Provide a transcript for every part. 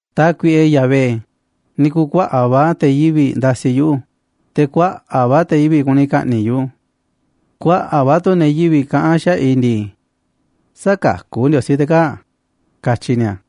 Tákuiꞌe Yahvé, ni̱ ku̱u̱ kuaꞌa̱ꞌ va̱ te̱ yivi̱ꞌ ndasiꞌ yuꞌu̱, te̱ kuaꞌa̱ꞌ va̱ te̱ yivi̱ꞌ kuni ka̱ꞌni̱ꞌ yuꞌu̱. Kuaꞌa̱ꞌ va̱ tu̱ ne̱ yivi̱ꞌ kaꞌán xaꞌa̱ꞌ i̱ ndii: “Sä̱kakú Ndiosí te̱ kaa̱ꞌ”, katyi ni̱a̱.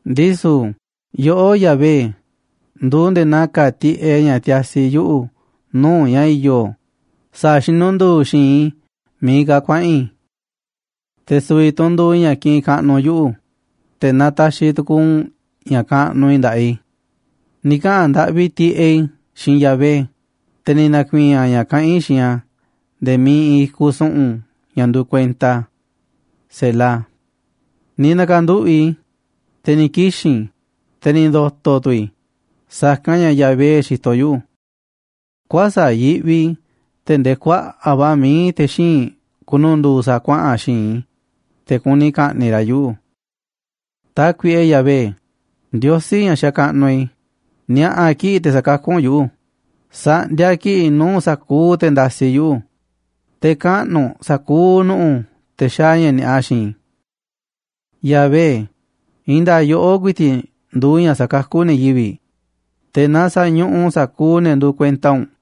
Ndisu̱ yoꞌó, Yahvé, nduuꞌ nde̱e̱ naa ka̱a̱ tiꞌeꞌ ña̱ tiasi yuꞌu̱ nuu̱ꞌ ña̱ i̱yo̱ sa̱a̱ xinundu̱u̱ xi̱i̱nꞌ i̱ miiꞌ ka̱ kuaꞌa̱n i̱. Te̱ su̱vi̱ tu̱ u̱nꞌ nduuꞌ ña̱ kiꞌinꞌ kaꞌnuꞌ yuꞌu̱, te̱ nataxiꞌ tukuuꞌ u̱nꞌ ña̱ kaꞌnuꞌ i̱ nda̱ꞌaꞌ i̱. Ni̱ kaꞌa̱n ndaꞌvi tiꞌeꞌ i̱ xiinꞌ Yahvé, te̱ ni̱ na̱ku̱i̱i̱n a̱ ña̱ kaꞌán i̱ xiinꞌ a̱ nde̱e̱ miiꞌ iinꞌ i̱kuꞌ su̱ꞌu̱n, ña̱ nduuꞌ kuenta a̱. Ni̱ na̱ka̱nduꞌu̱ꞌ i̱, te̱ ni̱ kixi̱n i̱, te̱ ni̱ ndo̱to̱ tu̱ i̱ sa̱kanꞌ ña̱ Yahvé xitoꞌ yuꞌu̱. Kuäsa̱ꞌ yiꞌvi i̱ tee̱ꞌ ndee kuaꞌa̱ꞌ va̱ mií te̱ xíinꞌ ku̱nu̱ndu̱u̱ sa̱a̱ kuaꞌa̱n xi̱i̱nꞌ i̱, te̱ kuni ka̱ꞌni̱ꞌ ra̱ yuꞌu̱. Tákuiꞌe Yahvé, Ndiosí ña̱ xakaꞌnuꞌ i̱, ni̱a̱ꞌa̱ kiꞌi̱ꞌ te̱ sa̱kakú u̱nꞌ yuꞌu̱, sa̱ꞌndiaꞌ kiꞌi̱ꞌ nuu̱ꞌ sa̱kuuꞌ te̱ ndasiꞌ yuꞌu̱, te̱ kaꞌnu̱ u̱nꞌ sa̱kuuꞌ nu̱ꞌu̱ te̱ xaaꞌ ña̱ ni̱a̱ꞌa xiinꞌ i̱. Yahvé, i̱i̱n nda̱a̱ꞌ yoꞌó ku̱i̱ti̱ꞌ nduuꞌ ña̱ sakakú ne̱ yivi̱ꞌ, te̱ na sañuꞌuꞌ u̱nꞌ sa̱kuuꞌ ne̱ nduuꞌ kuenta u̱nꞌ.